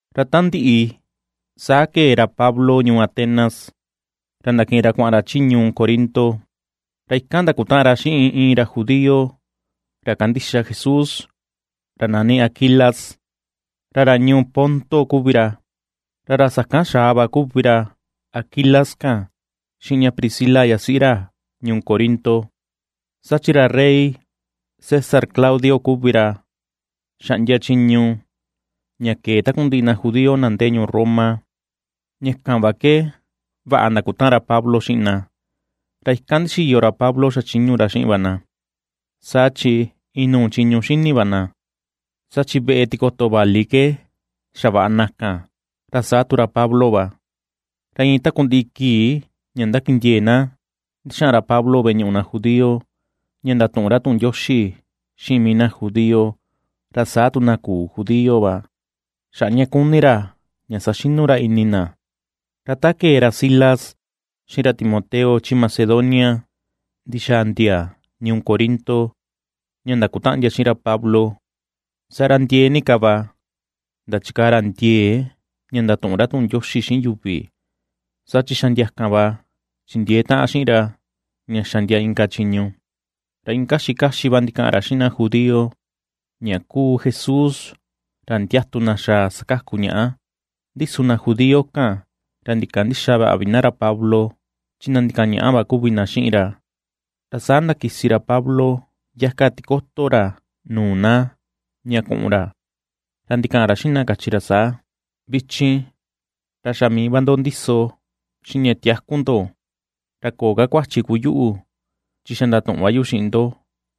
Ra ta ndiꞌi, saa kee ra Pablo ñuu Atenas, ra ndakiꞌin ra kuaꞌan ra chi ñuu Corinto. Ra ikan ndakutaꞌan ra xiꞌin iin ra judío, ra kandixa Jesús, ra nani Aquilas, ra ra ñuu Ponto kuvi ra. Ra ra sakan xaa va kuvi ra Aquilas kan xiꞌin ña Priscila yasiꞌi ra ñuu Corinto, saa chi ra rey César Claudio kuvi ra xaꞌndia chiñu ña kee takundiꞌi na judío na ndee ñuu Roma. Ña kan va ke vaꞌa ndakutaꞌan ra Pablo xiꞌin na. Ra ikan ndixiyo ra Pablo xachiñu ra xiꞌin va na, saa chi inuu chiñu xini va na, saa chi veꞌe tikoto vali ke xavaꞌa na kan, ra saa tu ra Pablo va. Ra iin takundiꞌi kii ña ndakindiee na ndixaꞌan ra Pablo veꞌe ñuꞌu na judío, ña ndatuꞌun ra tuꞌun Ndioxi xiꞌin mii na judío, ra saa tu na küu judío va, xaꞌa ña kuni ra ña saxinu ra ini na. Ra ta kee ra Silas xiꞌin ra Timoteo chi Macedonia ndixaa ndia ñuu Corinto ña ndakutaꞌan ndia xiꞌin ra Pablo, saa ra ndiee ni ka va ndachikaa ra ndiee ña ndatuꞌun ra tuꞌun Ndioxi xiꞌin yuvi, saa chi xa ndia kan va chindiee taꞌan xiꞌin ra ña xa ndia inka chiñu, ra iin kaxi kaxi va ndikaꞌan ra xiꞌin na judío ña kuu Jesús, ra ndiatu na xaa sakaku ñaꞌa. Ndi su na judío kan, ra ndikandïxa vaꞌa vi na ra Pablo chi na ndikañaꞌa va kuvi na xiꞌin ra. Ra saa ndakisi ra Pablo yaka tikoto ra nuu na ña kuꞌun ra, ra ndikaꞌan ra xiꞌin na, kachi ra saa: ―Vichin, ra xa mii va ndo ndiso xiꞌin ña tiaku ndo; ra köo ka kuachi kuu yuꞌu, chi xa ndatuꞌun va yu xiꞌin ndo,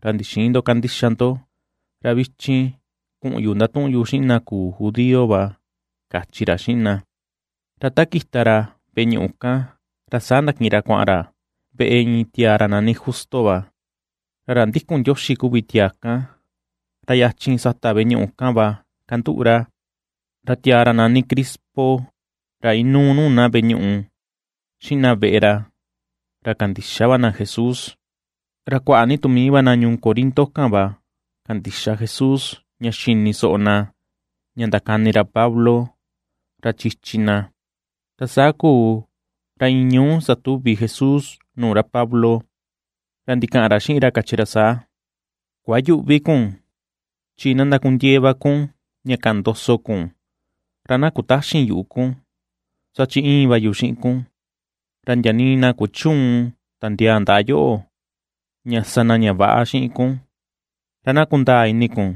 ra ndixïn ndo kandixa ndo. Ra vichin kuꞌun yu ndatuꞌun yu xiꞌin na küu judío va ―kachi ra xiꞌin na. Ra ta kita ra veꞌe ñuꞌu kan, ra saa ndakiꞌin ra kuaꞌan ra veꞌe iin tiaa ra nani Justo va, ra ra ndikun Ndioxi kuvi tiaa kan, ra yachin sata veꞌe ñuꞌu kan va kanduꞌu ra. Ra tiaa ra nani Crispo, ra inuu nuu na veꞌe ñuꞌu, xiꞌin na veꞌe ra, ra kandixa va na Jesús. Ra kuaꞌa ni tu mii va na ñuu Corinto kan va kandixa Jesús ña xini soꞌo na ña ndakani ra Pablo, ra chichi na. Ra saa kuu, ra iin ñuú, satuvi Jesús nuu ra Pablo, ra ndikaꞌan ra xiꞌin ra, kachi ra saa: ―Kuayüꞌvi kun; chi na ndakundiee va kun, ña kaꞌan ndoso kun, ra na kutäxin yuꞌu kun. Saa chi íin va yu xiꞌin kun, ra ndia nii na kuchüun tandiaa ndaꞌa yoꞌo, ña sa na ña väꞌa xiꞌin kun, ra na kundaa ini kun,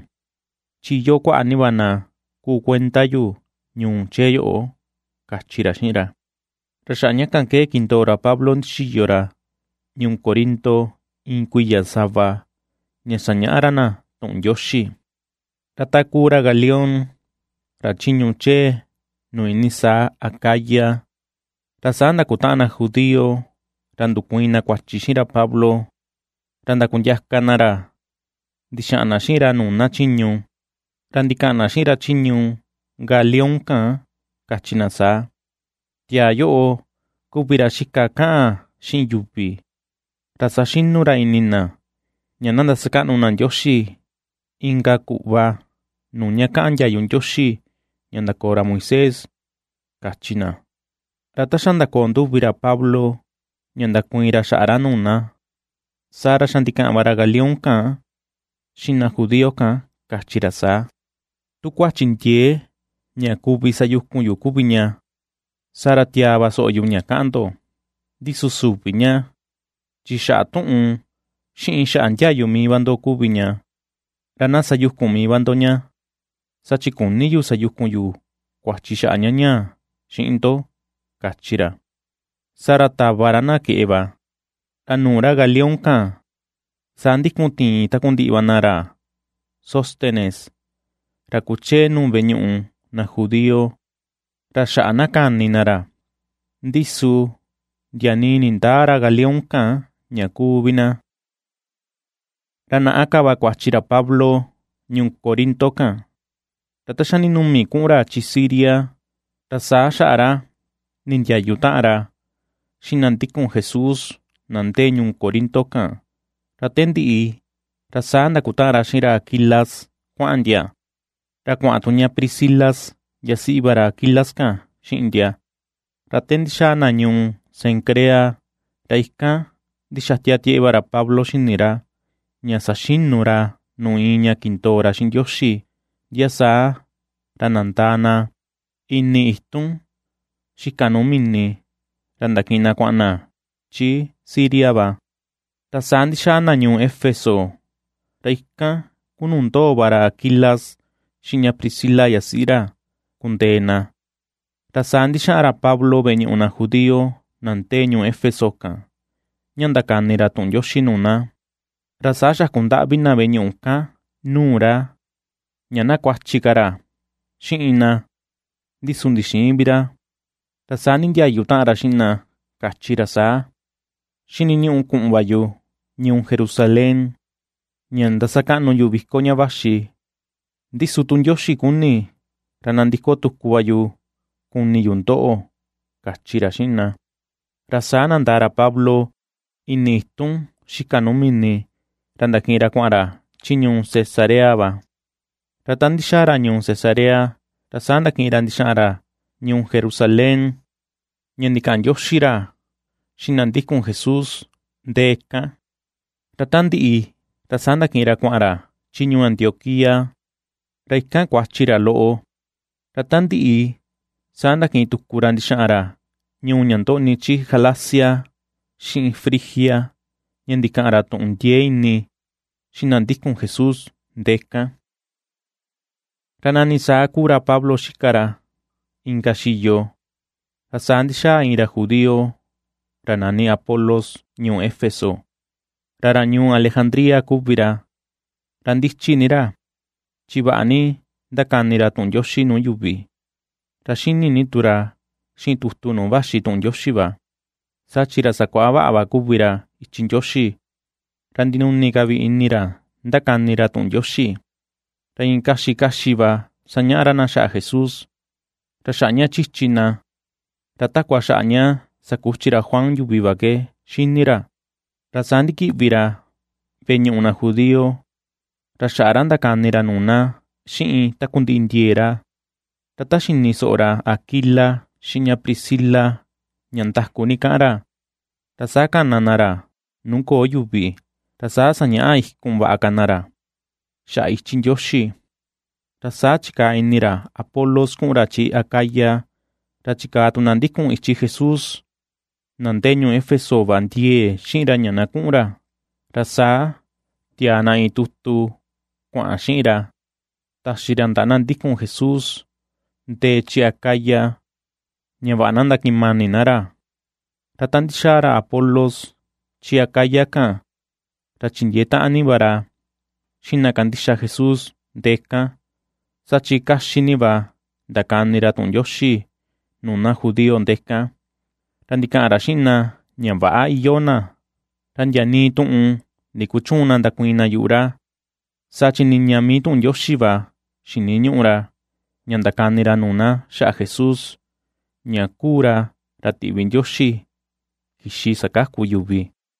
chi iyoo kuaꞌa ni va na kuu kuenda yu ñuu chee yoꞌo ―kachi ra xiꞌin ra. Ra xaꞌa ña kan ke kindoo ra Pablo ndixiyo ra ñuu Corinto iin kuiya sava, ña sañaꞌa ra na tuꞌun Ndioxi. Ra ta kuu ra Galión ra chiñu chee nuu iinii saa Acaya, ra saa ndakutaꞌan na judío ra ndukuiin na kuachi xiꞌin ra Pablo. Ra ndakundiaka na ra ndixaꞌan na xiꞌin ra nuu na chiñu. Ra ndikaꞌan na xiꞌin ra chiñu Galión kan, kachi na saa: ―Tiaa yoꞌo kuvi ra xika kaꞌan xiꞌin yuvi, ra saxinu ra ini na, ña na ndasakaꞌnu na Ndioxi, inka kuꞌva nuu ña käꞌan ndiayu Ndioxi ña ndakoo ra Moisés ―kachi na. Ra ta xa ndakoo nduvi ra Pablo ña ndakuiin ra xaꞌa ra nuu na, saa ra xa ndikaꞌan va ra Galión kan xiꞌin na judío kan, kachi ra saa: ―Tu kuachi ndiee ña kuvi sayukun yu kuvi ña, saa ra tiaa va soꞌo yu ña kaꞌan ndo. Ndi su süvi ña chi xaꞌa tuꞌun, xiꞌin xaꞌa ndiayu mii va ndo kuvi ña, ra na sayukun mii va ndo ña, saa chi küni yu sayukun yu kuachi xaꞌa ña ñaa xiꞌin ndo ―kachi ra. Saa ra tava ra na keꞌe va. Ra nuu ra Galión kan saa ndikun tiin takundiꞌi va na ra Sóstenes, ra kuchee nuu veꞌe ñuꞌu na judío, ra xaꞌa kani na ra, ndi su nindäa ra Galión kan ña kuu vi na. Ra naꞌa ka va kuachi ra Pablo ñuu Corinto kan. Ra ta xa ndinumi kuꞌun ra chi Siria, ra saa xaꞌa ra nindiayu taꞌan ra xiꞌin na ndikun Jesús na ndee ñuu Corinto kan. Ra te ndiꞌi ra saa ndakutaꞌan ra xiꞌin ra Aquilas kuaꞌan ndia, ra kuaꞌan tu ña Priscila yasiꞌi va ra Aquilas kan xiꞌin ndia, ra te ndixaa na ñuu Cencrea, ra ikan ndixatia tieꞌe va ra Pablo xini ra, ña saxinu ra nuu iin ña kindoo ra xiꞌin Ndioxi. Ndia saa ra nandaa na ini itun xika nuu mini, ra ndakiꞌin na kuaꞌan na chi Siria va. Ra saa ndixaa na ñuu Éfeso, ra ikan kuu nuu ndoo va ra Aquilas xiꞌin ña Priscila yasiꞌi ra kundee na. Ra saa ndixaꞌan ra Pablo veꞌe ñuꞌu na judío na ndee ñuu Éfeso kan ña ndakani ra tuꞌun Ndioxi nuu na. Ra saa xaku ndaꞌvi na veꞌe ñuꞌu kan nuu ra, ña na kuachi ka ra xiꞌin na ndi su ndixïin vi ra. Ra saa nindiayu taꞌan ra xiꞌin na, kachi ra saa: ―Xiniñuꞌu kuꞌun va yu ñuu Jerusalén ña ndasakaꞌnu yu viko ña vaxi, ndi su tu Ndioxi kuni, ra nandiko tuku va yu, kuni yu ndoꞌo ―kachi ra xiꞌin na. Ra saa nandaa ra Pablo ini itun xika nuu mini ra ndakiꞌin ra kuaꞌan ra chi ñuu Cesarea va. Ra ta ndixaa ra ñuu Cesarea, ra saa ndakiꞌin ra ndixaꞌan ra ñuu Jerusalén ña ndikaꞌan ndioxi ra xiꞌin na ndikun Jesús ndee kan, ra ta ndiꞌi, ra saa ndakiꞌin ra kuaꞌan ra chi ñuu Antioquía. Ra ikan kuachi ra loꞌo, ra ta ndiꞌi saa ndakiꞌin tuku ra ndixaꞌan ra ñuu ña ndoꞌni chi Galacia xiꞌin Frigia, ña ndikaꞌan ra tuꞌun ndiee ini xiꞌin na ndikun Jesús ndee kan. Ra nani saa kuu ra Pablo xika ra inka xiyo. Ra saa ndixaa iin ra judío ra nani Apolos ñuu Éfeso, ra ra ñuu Alejandría kuvi ra. Ra ndichi ni ra chi vaꞌa ni ndakani ra tuꞌun Ndioxi nuu yuvi, ra xini ni tu ra xiꞌin tutu nuu vaxi tuꞌun Ndioxi va. Saa chi ra sakuaꞌa vaꞌa va kuvi ra ichi Ndioxi, ra ndinuni ka vi ini ra ndakani ra tuꞌun Ndioxi, ra iin kaxi kaxi va sañaꞌa ra na xaꞌa Jesús, ra xaꞌa ña chichi na, ra takua xaꞌa ña sakuchi ra Juan yuvi va ke xini ra. Ra saa ndikiꞌvi ra veꞌe ñuꞌu na judío, ra xaꞌa ra ndakani ra nuu na xiꞌin takundiꞌi ndiee ra; ra ta xini soꞌo ra Aquila xiꞌin ña Priscila ña ndaku ni kaꞌan ra, ra saa kana na ra nuu köo yuvi, ra saa sañaꞌa ikun vaꞌa ka na ra xaꞌa ichi Ndioxi. Ra saa chikaa ini ra Apolos kuꞌun ra chi Acaya, ra chikaa tu na ndikun ichi Jesús, na ndee ñuu Éfeso va ndiee xiꞌin ra ña na kuꞌun ra. Ra saa tiaa na iin tutu kuaꞌan xiꞌin ra taxi ra ndaꞌa na ndikun Jesús ndee chi Acaya, ña vaꞌa na ndakiꞌin mani na ra. Ra ta ndixaa ra Apolos chi Acaya kan, ra chindiee taꞌan ni va ra xiꞌin na kandixa Jesús ndee kan. Saa chi kaxi ni va ndakani ra tuꞌun Ndioxi nuu na judío ndee kan, ra ndikaꞌan ra xiꞌin na ña väꞌa iyoo na, ra ndia nii tuꞌun ndikuchüun na ndakuiin na yuꞌu ra, saa chi niña mii tuꞌun Ndioxi va xiniñuꞌu ra ña ndakani ra nuu na xaꞌa Jesús, ña kuu ra ra tiꞌvi Ndioxi kixi sakaku yuvi.